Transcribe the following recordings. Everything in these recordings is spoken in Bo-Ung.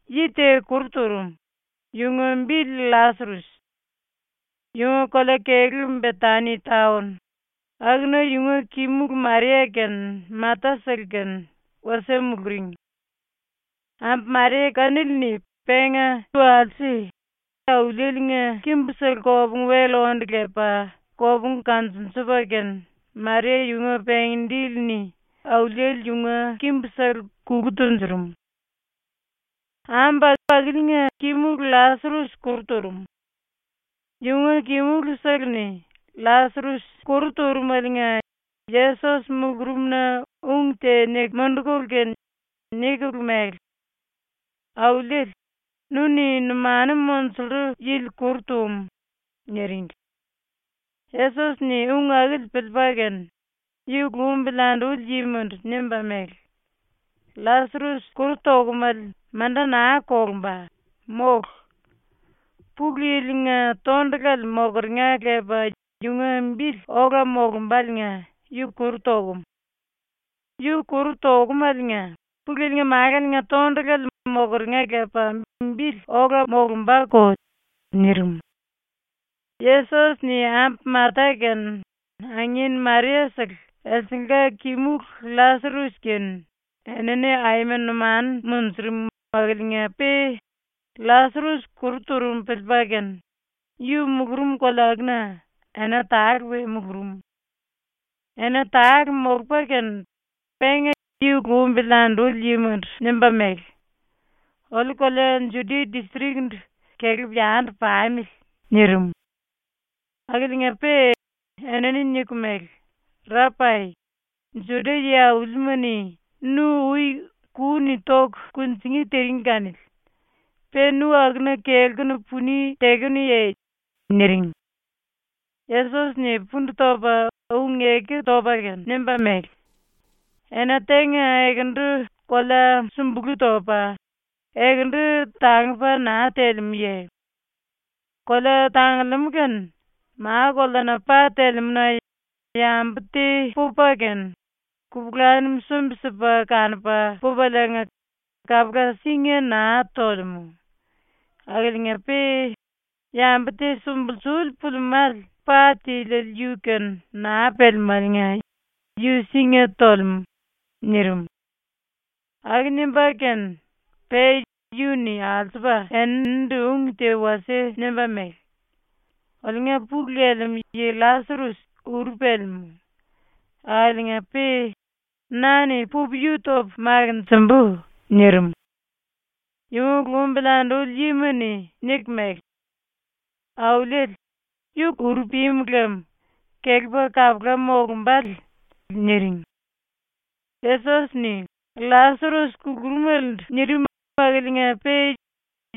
Yi te kuru turum, yunga bili LLasares. Yunga kolea-kelú Betani taon, akuna yunga kimulu Maria kene Mata-sele kene wasie muluring. Ambu Maria kanili-ni penga walse Auliele-nga kimbusele kopungu-wel onde lepa kopungu kanjunjupa kene Maria yunga pengí-dili-ni Auliele yunga kimbusele kulu tunjurum. Ambu akiliinga kimulu LLasares kuru turum. Yunga kimulusele-ni LLasares kuru turumeliinga Yesos mulurumna ung te niku mundukulu kene nikulu mele: “Auliele, nu-ni numanu monjullu yili kuru tum.” niringli. Yesos-ni ung akili piliipa kene yu lumbili anduli yimandu nimba mele: “LLasares kuru tokumale manda naa kolumba, mólu. Pulu Yili-nga tondulale mokeringa lepa yunga bili ola molumbáliinga yu kuru tokum. Yu kuru tokumaliinga Pulu Yili-nga Málale-nga tondulale mokeringa lepa bili ola molumbako.” nirim. Yesos-ni ambu Mata kene angin Maria-sele elsengla kimulu LLasares kene enini aima numanu munjurum akiliinga-pe LLasares kuru turum piliipa kene yu mulurum kolea akuna ena tale we mulurum. Ena tale molupa kene penga yu lumbili anduli yimandu nimba mele: “Oliu kolea Judia distrik-ndu kelepu yandu pamili.” nirim. Akiliinga-pe enini niku mele: “Rapai, Juda yi-aulima-ni nu ui ku-ni toku kunjingí tiring kanili. Pe nu akuna kelkunu puni tekenuye?” niring. Yesos-ni pundu topa ⸤ung-eku topa kene⸥ nimba mele: “Ena tenga ekendu kolea súmbulu topa, ekendu tangupa naa telemúye? Kolea tangulemú kene ma-koleana pa telemúna yambu te pupa kene kupulanum sumbi-sipa kanupa pupaliinga kapula singa naa tolemú. Akiliinga-pe yambu te sumbulsuli pulimále pa tiliele yu-kene naa pelemáliinga yu singa tolemú.” nirim. Aku nimba kene pe yu-ni alsupa eninindu ung te wasie nimba mele: “Oliunga pulu lelemú yi LLasares uru pelemú. Akiliinga-pe na-ni pupu yu topu makinjimbu.” nirim. Yunga lumbili anduli yima-ni niku mele: “Auliele, yu uru pimu lem kelepa kapula molumbále.” niring. Yesos-ni LLasares kulurumelendu nirim akiliinga-pe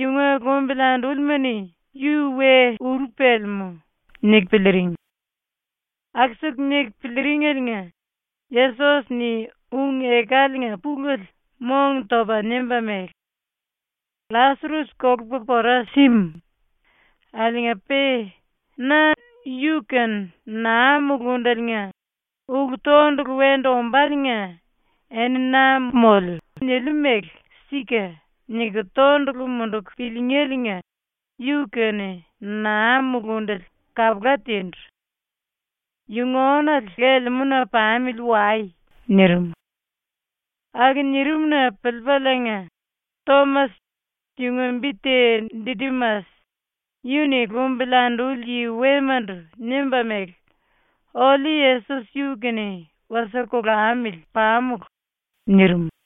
yunga lumbili andúlima-ni ‘Yu we uru pelemú.’ niku piliiring. Aku-siku niku piliiringeliinga Yesos-ni ung-ekaliinga pulele mong-topa nimba mele: “LLasares kolupa pora símu.” ⸤nirim.⸥ “Akiliinga-pe na yu-kene naa mulundeliinga ulu-tondulu wendu ombáliinga eni na moliu niliu mele ‘Sika’ niku tondulu munduku piliingéliinga yu-kene naa mulundele kapula tindu. Yu⸤nga ónale⸥ lelemúna pamili wai.” nirim. Aku nirim-na piliipaliinga, Tomas, yunga bi te Didimas, yu-ni lumbili anduli yi wemandu nimba mele: “Oliu Yesos yu-kene wasie kolamili pamulu.” nirim.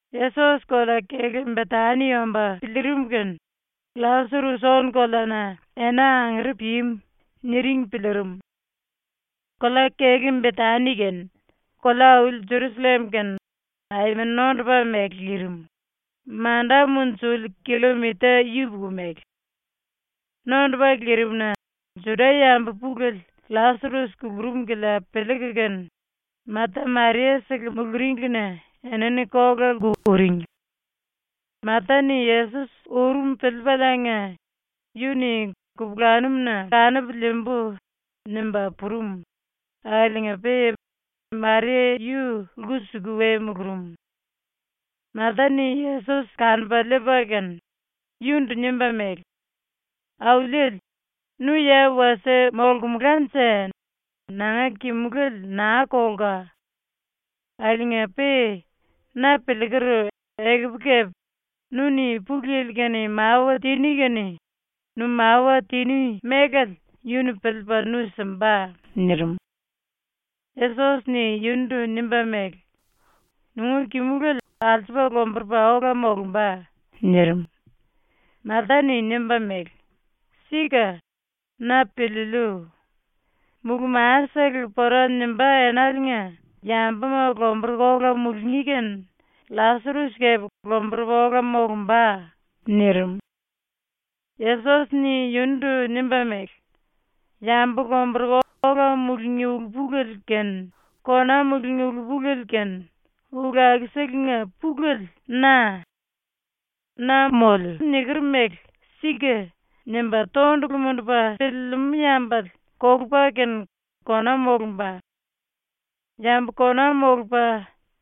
Yesos kolea-kelú Betani omba piliirim kene “LLasares ónu-koleana ena angere pimu.” niring piliirim. Kolea-kelú Betani kene kolea-auli Jerusallem kene aima nondupa mele lirim, manda munjuli killomita yupuku mele. Nondupa lirim-na Juda-yambu pulele LLasares kulurum kilia piliiku kene Mata Maria-sele muluringlina enini kola-lku uring. Mata-ni Yesos urum piliipaliinga yu-ni ‘Kupulanum-na kanupu liimbu.’ nimba purum, akiliinga-pe Maria yu lku-suku we mulurum. Mata-ni Yesos kanupa liipa kene yundu nimba mele: “Auliele, nu ya wasie molkumulanje nanga kimulele naa kolka.” ⸤nirim.⸥ “Akiliinga-pe na piliiker, ekupu kepe nu-ni Pulu Yili-kene mawa tiní kene nu mawa tiní melale yu-ni piliipa nu simba.” nirim. Yesos-ni yundu nimba mele: “Nunga kimulele alsupa lomburupa ola molumba.” nirim. Mata-ni nimba mele: “Sika, na piliiliu. Mulú-masele pora nimbá enaliinga yambuma lomburuku ola mulungí kene LLasares kepe lomburupa ola molumba.” nirim. Yesos-ni yundu nimba mele: “Yambu lomburuku ola mulungí ulu-pulele kene kona mululi ulu-pulele kene ulu akuselenga pulele na.” ⸤nirim.⸥ “Na moliu niker mele ‘Sika’ nimba tondulu mundupa piliilimú yambale kolupa kene kona molumba. Yambu kona molupa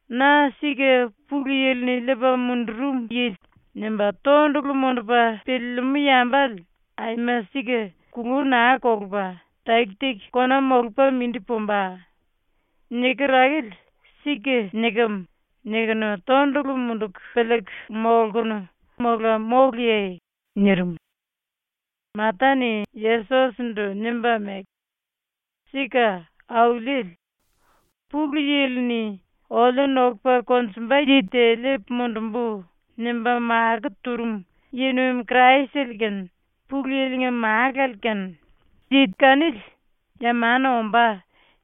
‘Na sika ⸤Pulu Yili-ni liipa mundurum yili⸥.’ nimba tondulu mundupa piliilimú yambale aima sika kului naa kolupa taki-taki kona molupa mindi pumba. Niker akili ‘Sika nikem.’ nikunu tondulu munduku piliiku molkunu mola móluye?” nirim. Mata-ni Yesos-ndu nimba mele: “Sika, Auliele. ‘Pulu Yili-ni ‘Oliu nokupa konjumba yi te liipu mundumbu.’ nimba makó turum yi-nuim Kraisele kene Pulu Yili-nga Málale kene, yi kanili “Ya mana ombá.”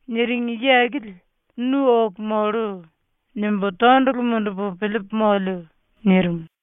niring yi akili nu oku mollu.’ nimbu tondulu mundupu piliipu moliu.” nirim.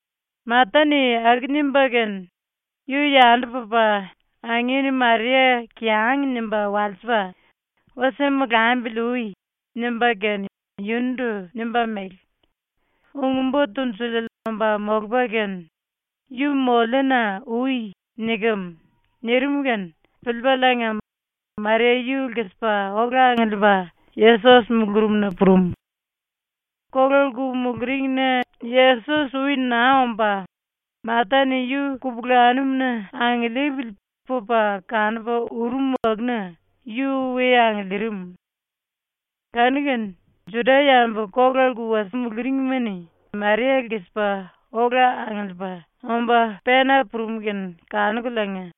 Mata-ni aku nimba kene yu yandu pupa angin Maria kiyang nimba walsipa “Wasie molambili ui.” nimba kene yundu nimba mele: “Ung-Bo Tunjuliele omba molupa kene, “Yu moliuna ui.” nikem.” nirim kene piliipaliinga Maria yu lkisipa ola angiliipa Yesos mulurumna purum. Kola-lku muluringna Yesos ui naa omba, Mata-ni yu kupulanum-na angiliipili pupa kanupa urum akuna yu we angiliirim. Kanu-kene Juda-yambu kola-lku wasie muluringma-ni Maria lkisipa ola angiliipa omba pena purum kene kanukuliinga,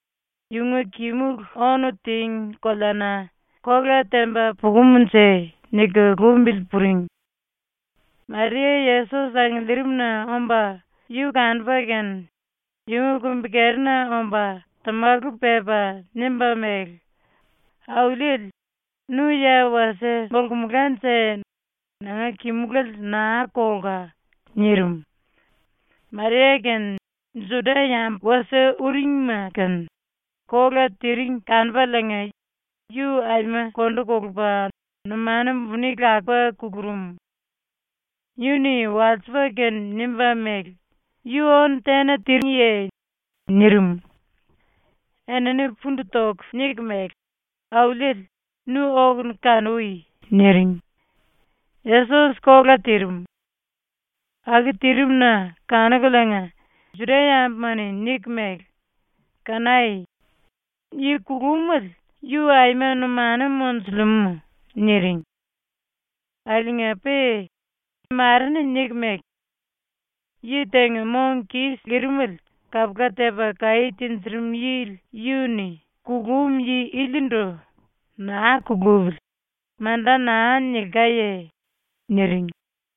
‘Yunga kimulu ónu tíngi koleana kola temba pukumnje.’ niku lumbili puring. Maria Yesos angiliirimna omba yu kanupa kene yunga kumbi-kerina omba tamalu pepa nimba mele: “Auliele, nu ya wasie molkumulanje nanga kimulele naa kolka.” nirim. Maria kene Juda-yambu wasie uringma kene kola tiring kanupaliinga yu aima kondu kolupa numanu buni lakupa kulurum. Yu-ni walsipa kene nimba mele: “Yu ónu tena tíngiye?” nirim. Enini pundu toku niku mele: “Auliele, nu okunu kanui.” niring. Yesos kola tirim. Aku tirim-na kanukuliinga Juda-yambuma-ni niku mele: “Kanai. Yi kulumele yu aima numanu monjulemú.” niring. Akiliinga-pe mare-ni niku mele: “Yi tenga mong kis lirimele kapula tepa kaí tinjirim yili yu-ni kulum yi ilindu “Naa kulupili.” manda naa nilkaye?” niring.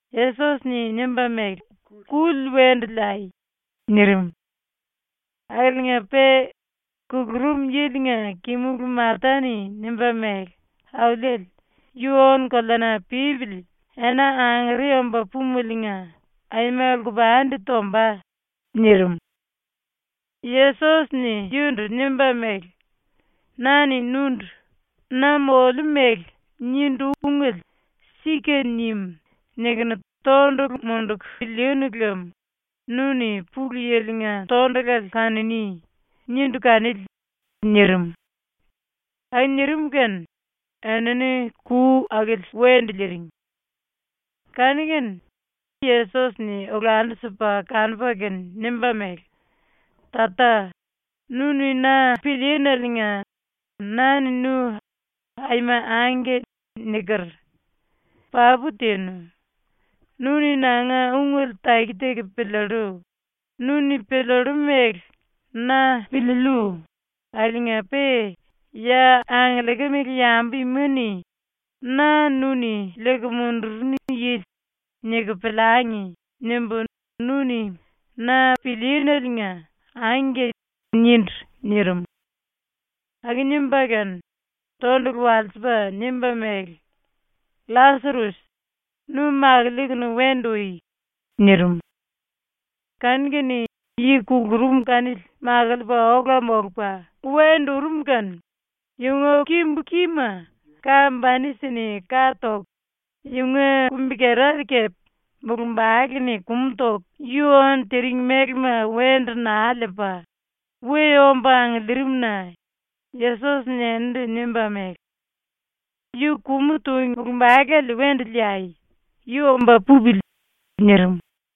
Yesos-ni nimba mele: “Kuli wendu liai.” nirim. Akiliinga-pe kulurum yilinga kimulu Mata-ni nimba mele: “Auliele, yu ónu-koleana pípili ena angere omba púmeliinga aima lkupandi tomba.” nirim. Yesos-ni yundu nimba mele: “Na-ni nundu “Na moliu mele nindu ungele ‘Sika nim.’ nikunu tondulu munduku pilíínu lem nu-ni Pulu Yili-nga tondulale kanuní.” nindu kanili.” nirim. Aku nirim kene enini ku akili wendu liiring. Kanu-kene Yesos-ni olandu-sipa kanupa kene nimba mele: “Tata, nu-ni na pilííneliinga na-ni nu ‘Aima angke.’ niker. Papu tinu. Nu-ni nanga ungele taki-taki piliillu, nu-ni piliillu mele na piliiliu akiliinga-pe ‘Ya angiliikimele yambu ima-ni ‘Na nu-ni liiku mundurunu yili.’ niku piliangi.’ nimbu nu-ni “Na pilííneliinga angke.” nindu.” nirim. Aku nimba kene, tondulu walsipa nimba mele: “LLasares, nu makiliikunu wendu ui.” nirim. Kanu-kene yi kulurum kanili makiliipa ola molupa wendu urum kene yunga kimbu-kima ka-banisi-ni ka toku yunga kumbi-kerale kepe mulumbale-ni kumu toku yu ónu tiring mélema wendu naa liipa we omba angiliirim-na Yesos-ni eninindu nimba mele: “Yu kumu tung mulumbalele wendu liai. Yu omba pupili.” nirim.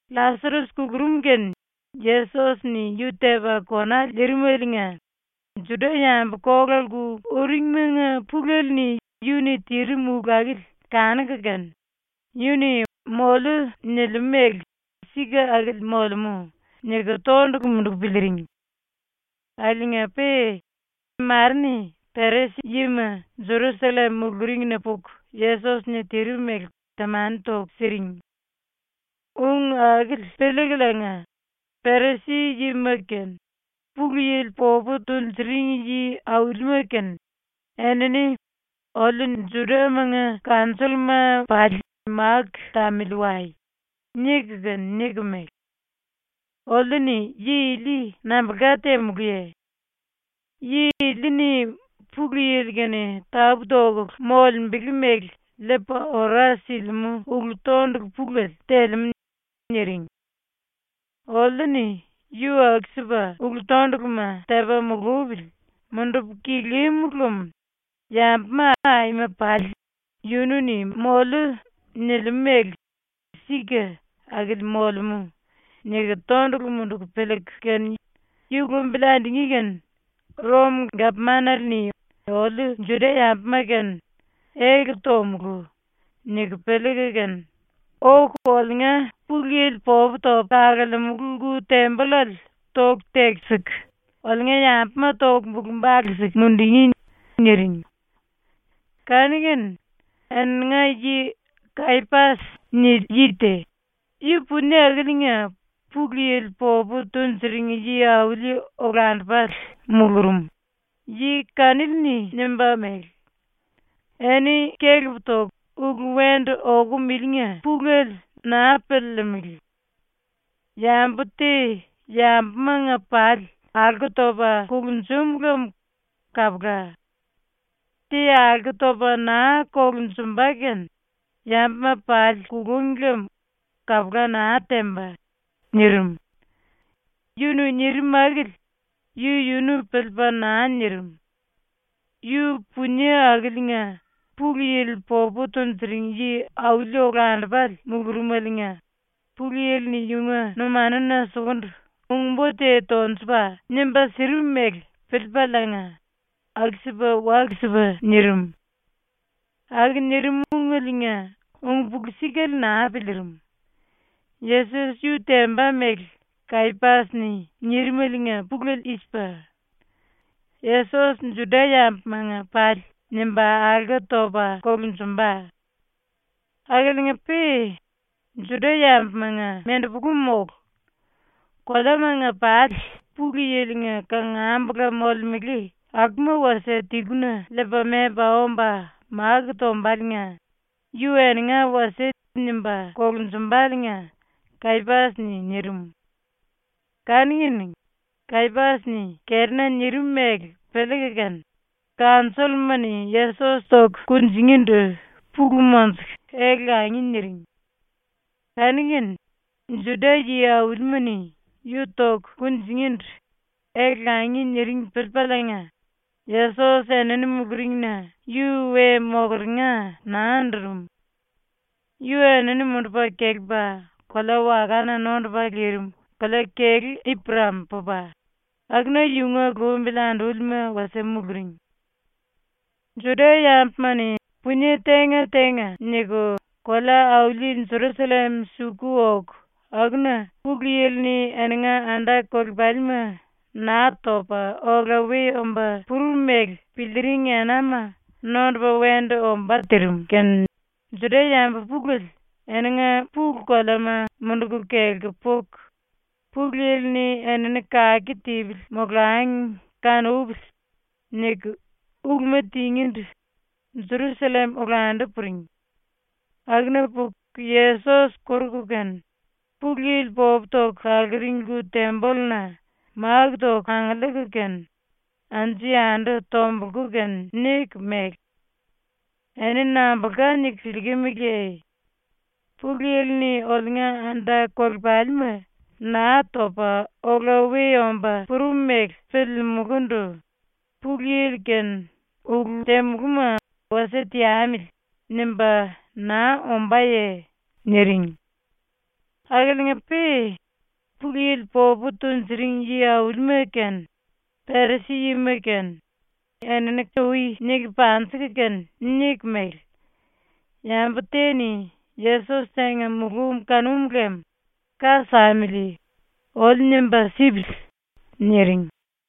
⸤LLasares kulurum kene Yesos-ni yu tepa kona lirim⸥eliinga Juda-yambu kola-lku uringmanga pulele-ni yu-ni tirim ulu akili kanuku kene ‘Yu-ni “moliu” nilimú mele sika akili molemú.’ niku tondulu munduku piliiring. Akiliinga-pe mare-ni Perisi-yima Jerusallem muluringna puku Yesos-ni tirim mele temani toku siring. Ung akili piliikuliinga Perisi-yima kene Pulu Yili popu tunjuring yi-aulima kene enini “Oliu Judamanga kanjolluma pali máku tamili wai.” niku kene niku mele: “Oliu-ni yi ili nambulka temulúye? Yi ili-ni Pulu Yili-kene tapú-tokulu molembele mele liipa ora silimú ulu-tondulu pulele telemú.” ⸤niring⸥. “Oliu-ni yu aku-sipa ⸤ulu-tonduluma⸥ tepa mulupili mundupu kilímulu lem yambuma aima pali ‘Yunu-ni “moliu” nilimú mele sika akili molemú.’ niku tondulu munduku piliiku kene ⸤yu lumbili andungí⸥ kene Rom-gapmanale-ni oliu ⸤Juda-yambuma⸥-kene ‘Ele tomulú.’ niku piliiku kene, oku oliunga Pulu Yili popu topu kalemulu lku-tembollale toku tekisiku oliunga yambuma toku bulu-bale siku mundungí.” niring. Kanu-kene eninga yi ‘Kayapas’ nili yi te, yu punie akiliinga Pulu Yili popu tunjuring yi-auli olandupale mulurum, yi kanili-ni nimba mele: “Eni kelep toku ulu wendu okum ilinga pulele naa piliilimili. Yambu te yambumanga pali alko topa kulunjum lem kapula. Te alko topa naa kolunjumba kene yambuma pali kulung lem kapula naa temba.” nirim. Yu-ni nirim akili yu-yunu piliipa naa nirim. Yu punie akiliinga Pulu Yili popu tunjuring yi-auli olandupale mulurumeliinga Pulu Yili-ni yunga numanuna sukundu ung-bo te tonjupa nimba sirim mele piliipaliinga aku-sipa walu-sipa nirim. ⸤Aku nirim ungeliinga ung-pulu-sikale naa piliirim.⸥ Yesos yu temba mele Kayapas-ni nirimaliinga pulele i-sipa: Yesos Juda-yambumanga pali nimba alko topa kolunjumba. Akiliinga-pe Juda-yambumanga mendepulu mólu. Koleamanga pali Pulu Yili-nga kangambula molemele akuma wasie tiluna liipa memba omba máku tombaliinga yu eninga wasie nimba kolunjumbáliinga Kayapas-ni nirim. Kanu-kene Kayapas-ni kerina nirim mele piliiku kene kanjolluma-ni Yesos toku kunjingíndu pulu monjuku ele-langi niring. Kanu-kene Juda yi-aulima-ni yu toku kunjingíndu ele-langi niring piliipaliinga Yesos enini muluringna yu we mokeringa naa andurum. Yu enini mundupa kelepa kolea-wakana nondupa lirim kolea-kelú Iprem pupa, akuna yunga lumbili andúlima wasie muluring. ⸤Juda-yambuma-ni punie tenga-tenga niku kolea-auli Jerusallem suku oku akuna⸥ Pulu Yili-ni eninga anda-kolepalima Naa Topa Ola We Omba Purum mele piliiring enama nondupa wendu ombá tirim kene Juda-yambu pulele eninga pulu-koleama munduku kelku puku, “Pulu Yili-ni enini kake tipili molangi kanupili.” niku uluma tingíndu Jerusallem olandu puring. Akuna puku Yesos koruku kene, Pulu Yili popu toku kaluring lku-tembolluna máku toku angiliiku kene anju-yandu tombulku kene niku mele: “Eni nambulka niku piliikimiliye? Pulu Yili-ni oliunga anda-kolepalima Naa Topa Ola We Omba Purum mele piliimulúndu Pulu Yili-kene ulu temulúma ‘wasie teamili.’ nimba naa ombáye?” niring. Akiliinga-pe Pulu Yili popu tunjuring yi-aulima kene Perisi-yima kene enini ui niku panjiku kene niku mele: “Yambu te-ni Yesos tenga mulum kanum lem ka samili oliu nimba sipili.” niring.